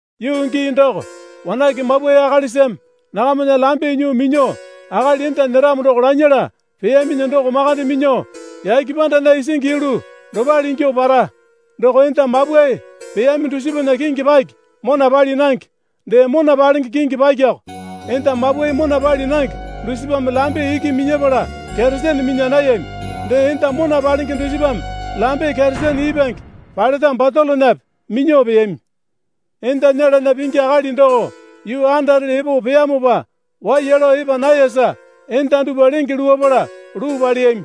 Yuu gii doko wanake mapwae akalisame nakamana lambe nyuo minya akali enda nyeramo doko lanyala peyaminyi doko makande minyuo yake pandana isingi yulu dopale ingyuo para. Doko enda mapwae peyami dusipana kingi paki mona pali nange, dee mona palenge kingi pakiko. Enda mapwae mona pali nange dusipame lambe iki minyapala keresene minya nayami. Dee enda mona palenge dusipame lambe keresene ipwange paleta batolonape minyuo peyami. Enda nyelana pingi akali doko yuu andarele epo peyamopa waiya lao epa nayasa enda dupwa lenge luwapala luu paleyami.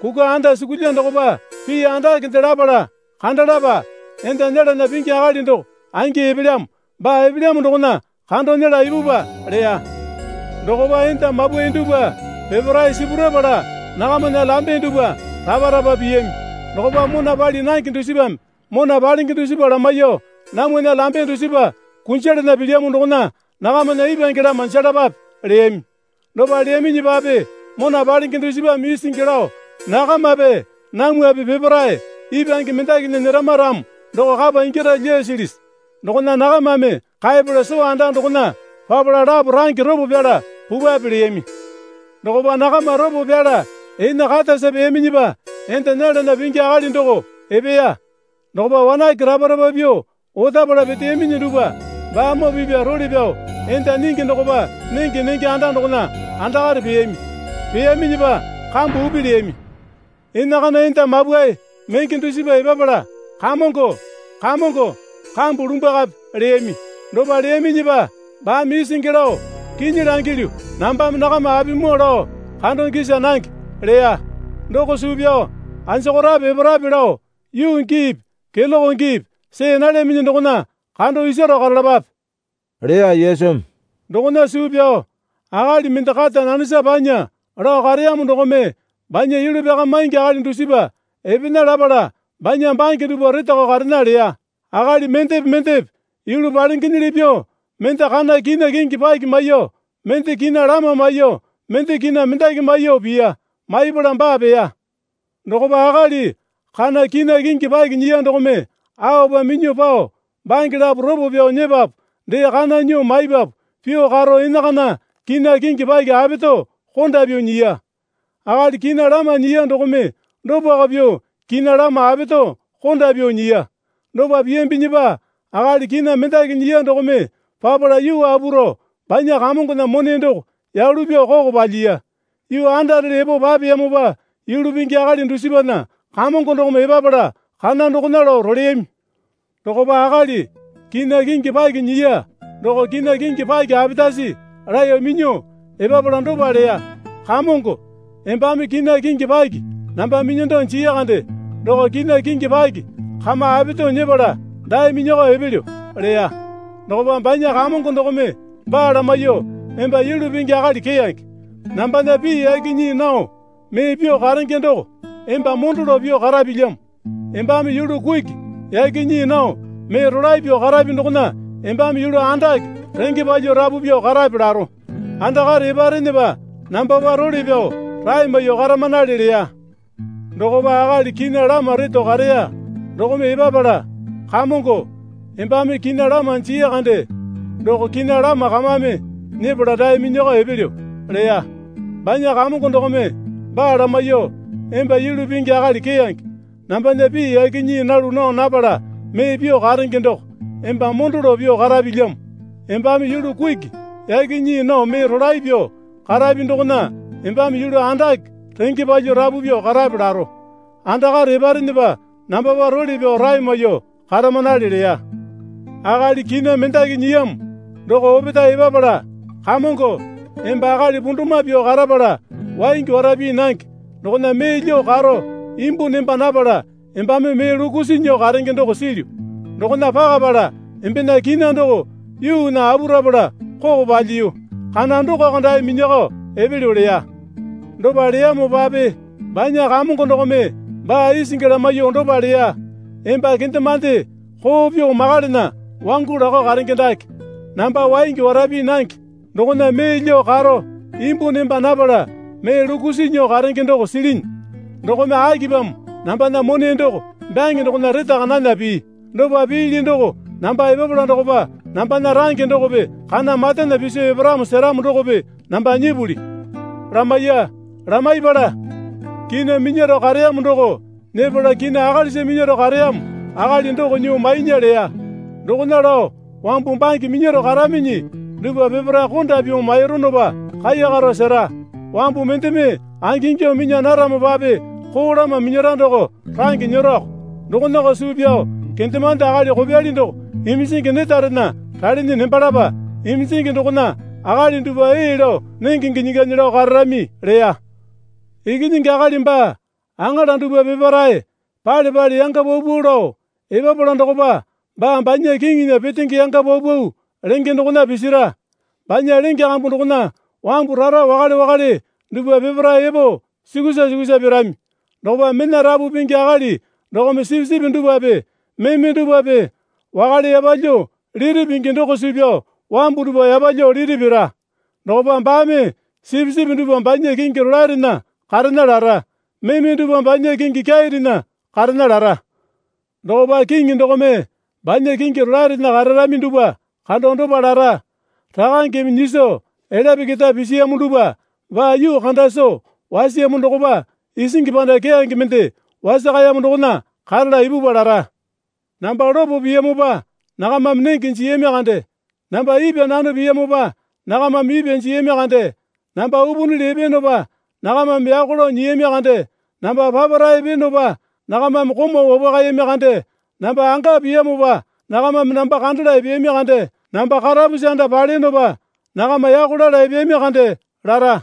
Kukwa andasukulya dokopa pii andakende lapala, Kandalapa. Enda nyelana pingi akali doko angi epelyamo. Baa epelyamo dokona kando nyela ipupwa, leya. Dokopa enda mapwae dupwa peparae sipurapala nakamana lambe dupwa rapa rapa piyami. Dokopa mona pali nange dusipame mona palenge dusipa lamaiyuo, Namwana lambe dusipa kunjalana pilyamo dokona nakamana ipwange lama jelapape, leyami. Dopa leyaminyipape mona palenge dusipame isingi lao, Nakamape namwape peparae ipwange mendakinya nyerama ramo doko kapa ingyara lyasilisi? Dokona nakamame kaepala sito anda dokona papala lapo range ropo pyala pupwape, leyami. Dokopa nakama ropo pyala ene katasa peyaminyipa enda nyelana pingi akali doko epeya. Dokopa wanake rapa rapa pyuo otapala peteyaminyi dupwa baamoo pipya role pyao enda nyingi dokopa nenge nenge anda dokona andakare peyami. Peyaminyipa kambu upi leyami. Enakana enda mapwae menge dusipa epapala, Kamongo, Kamongo, kambu lumbwakape, leyami. Dopa leyaminyipa baame isingi lao, Kinyi langilyu, nambame nakama apimoo lao kando gisa nange, leya. Doko suu pyao anjokorape eparape lao yuu giipi keloke giipi see nalyaminyi dokona kando isaro karalapape, leya Yesumi. Dokona suu pyao akali mende kata nanesa panya lao kareyamo dokome banya yulu pyakamaingi akali dusipa epena lapala banya bange dupwa retakao karena leya. Akali mendepe mendepe yulu palengenyili pyuo mende kana kina kingi paki maiyuo mende kina lama maiyuo mende kina mendaki maiyuo piya. Maipala baa peya. Dokopa akali kana kina kingi paki nyiya dokome aopa minyuo pao bange lapo ropo pyao nyepapu dee kana nyuo maipapu pyuo karo enakana kina kingi paki apeto konda pyuo nyiya. Akali kina lama nyiya dokome dopako pyuo kina lama apeto konda pyuo nyiya. Dopa piyambinyipa akali kina mendaki nyiya dokome papala yuu apu rao banya kamongona mone doko yalu pyuo koko palyiya. Yuu andarele epo papeyamopa yulu pingi akali dusipana kamongo dokome epapala kana dokona lao roleyami. Dokopa akali kina kingi paki nyiya doko kina kingi paki apetasi laeyo minyuo, epapala dopa leya. Kamongo, embame kina kingi paki namba minyando jii kande doko kina kingi paki kame apeto nyepala dae minyakao epelyo, leya. Dokopa banya kamongo dokome baa lamaiyuo, Emba yulu pingi akali keyange. Nambana pii yaki nyii nao mee pyuo karenge doko, emba mondo lao pyuo karapilyamo. Embame yulu kuki yaki nyii nao mee rolae pyuo karapi dokona embame yulu andake renge palyuo rapu pyuo karape laro. Andakare eparenepa nambapa role pyao rae maiyuo karamanale leya. Dokopa akali kina lama reto kareya dokome epapala, Kamongo, embame kina lama jii kande doko kina lama kamame nyepala dae minyakao, epelyo, leya. Banya kamongo dokome baa lamaiyuo, Emba yulu pingi akali keyange. Nambana pii yaki nyii nalu nao napala mee pyuo karenge doko, emba mondo lao pyuo karapilyamo. Embame yulu kuki yaki nyii nao mee rolae pyuo karapi dokona embame yulu andake renge palyuo rapu pyuo karape laro. Andakare eparenepa nambapa role pyao rae maiyuo karamanale leya. Akali kina mendaki nyiyamo doko opetae epapala, Kamongo, emba akali pundumwa pyuo karapala waingi wara pii nange dokona mee lyuo karo imbu nemba napala embame mee lukusi nyuo karenge doko silyu. Dokona pakapala embena kina doko yuunya apu rapala koko palyiyu. Kana dokoko dae minyuoko epelyo, leya. Dopa leyamopape banya kamongo dokome baa isingi lamaiyuo dopa leya. Emba kendemande koo pyuo makalana wangu lakao karenge dake, namba waingi wara pii nange dokona mee lyuo karo imbu nemba napala mee lukusi nyuo karenge doko silinyi. Dokome akipamo nambana mone doko byange dokona retaka nana pii. Dopa piili doko namba epapala dokopa nambana range dokope kana matana piso eparamo seramo dokope namba nyipuli, lamaiya. Lamaipala, kina minyaro kareyamo doko nyepala kina akalisa minyaro kareyamo akali doko nyuo mainya leya. Dokona lao wambu bange minyaro karaminyi dupwa peparae konda pyuo maironopa kaiyakaro sera. Wambu mendeme angingyuo minya naramopape koo lama minyara doko range nyeroko. Dokonako suu pyao kendemande akali kopyali doko iminjingi netarena ralinyi nembalapa. Iminjingi dokona akali dupwa ee lao nenge ginyi ganyi lao kararami, leya. Ikinyingi Akali baa aŋala dupwa peparae pale pale yanga paupau lao epapala dokopa baa banya kiŋinya petenge yanga paupau lenge dokona pisira. Banya lenge kambu dokona wambu rara wakale wakale dupwa peparae epo sukusa sukusa pirami. Dokopa mena rapu pingi akali dokome sipisipi dupwape meme dupwape wakale yapalyuo liti pingi doko suu pyao wambu dupwa yapalyuo liti pira. Dokopa baame sipisipi dupwa banya kingi rolaerena karena lara, meme dupwa banya kingi kyairena karena lara. Dokopa Kiŋi dokome banya kingi rolaerena kararami dupwa kando dopa lara. Rakangeme nyiso elyape keta pisiyamo dupwa baa yuu kanda soo wasiyamo dokopa isingi panda keyange mende wasakayamo dokona karala ipupwa lara. Namba lopo piyamopa nakamame nenge jiyami kande, namba ipwa nano piyamopa nakamame ipwa jiyami kande, namba upunili epeyonopa nakamame yako lao nyiyami kande Namba papara epeyonopa nakamame komau wapwakayami kande, namba anga piyamopa nakamame namba kandala epeyami kande, namba karapusi anda paleyonopa nakama yako lala epeyami kande lara.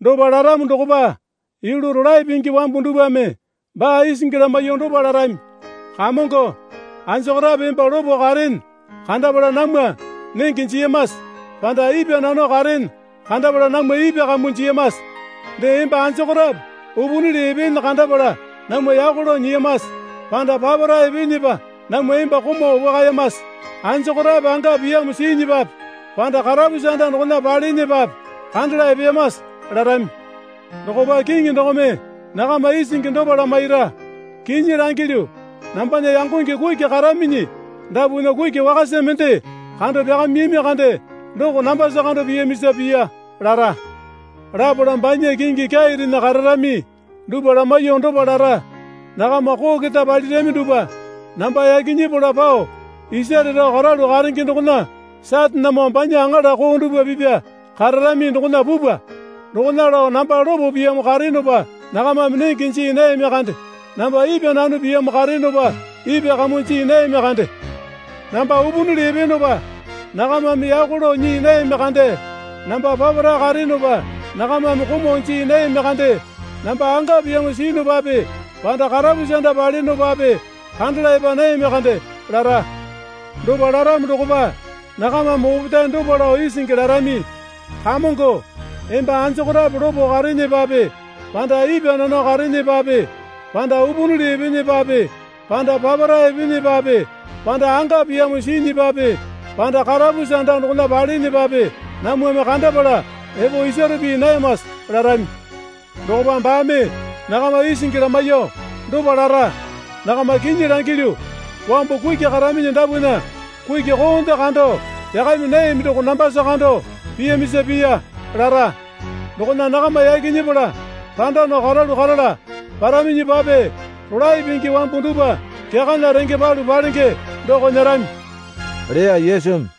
Dopa laramo dokopa yulu rolae pingi wambu dupwame baa isingi lamaiyuo dopa larami. Kamongo, anjokorape emba lopo kareene kandapala namwa nenge jiyamase panda ipwa nano kareene kandapala namwa ipwa kamuo jiyamase? Dee emba anjokorape upunili epeene kandapala namwa yako lao nyiyamase panda papara epeenepa namwa emba komau wapwakayamase? Anjokorape anga piyamo siinyipape panda karapusi anda dokona paleenepape kandala epeyamase? larami. Dokopa Kiŋi dokome nakama isingi dopa lamaira. Kinyi langilyu, nambana yangonge kuki karaminyi dapwana kuki wakasa mende kando pyakamiyami kande doko nambasa kando piyamisa piya, lara. Lapala banya kingi kyairena kararami dupwa lamaiyuo dopa lara. Nakama koo keta palirami dupwa, namba yaki nyepala pao isare rao karalu karene dokona Satanemoo banya aŋala koo dupwa pipya kararami dokona pupwa. Dokona lao namba lopo piyamo kareyonopa nakamame nenge jii nayami kande namba ipwa nano piyamo kareyonopa ipwa kamuo jii nayami kande. Namba upunili epeyonopa nakamame yako lao nyii nayami kande, namba papara kareyonopa nakamame komau jii nayami kande, namba anga piyamo siyunupape panda karapusi anda paleyonopape kandala epa nayami kande, lara. Dopa laramo dokopa nakamame opetae dopa lao isingi larami. Kamongo, emba anjokorape lopo kareenepape panda ipwa nano kareenepape panda upunili epeenepape panda papara epeenepape panda anga piyamo siinyipape panda karapusi anda dokona paleenepape namwame kandapala epo isaro pii nayamase? larami. Dokopa baame nakama isingi lamaiyuo dopa lara. Nakama kinyi langilyu, wambu kuki karaminyi dapwana kuki koonde kando pyakami nayami doko nambasa kando piyamisa piya, lara. Dokona nakama yaki nyepala randa nao karalu karala paraminyipape rolae pingi wambu dupwa kyakana renge palu palenge doko nyerami leya Yesumi.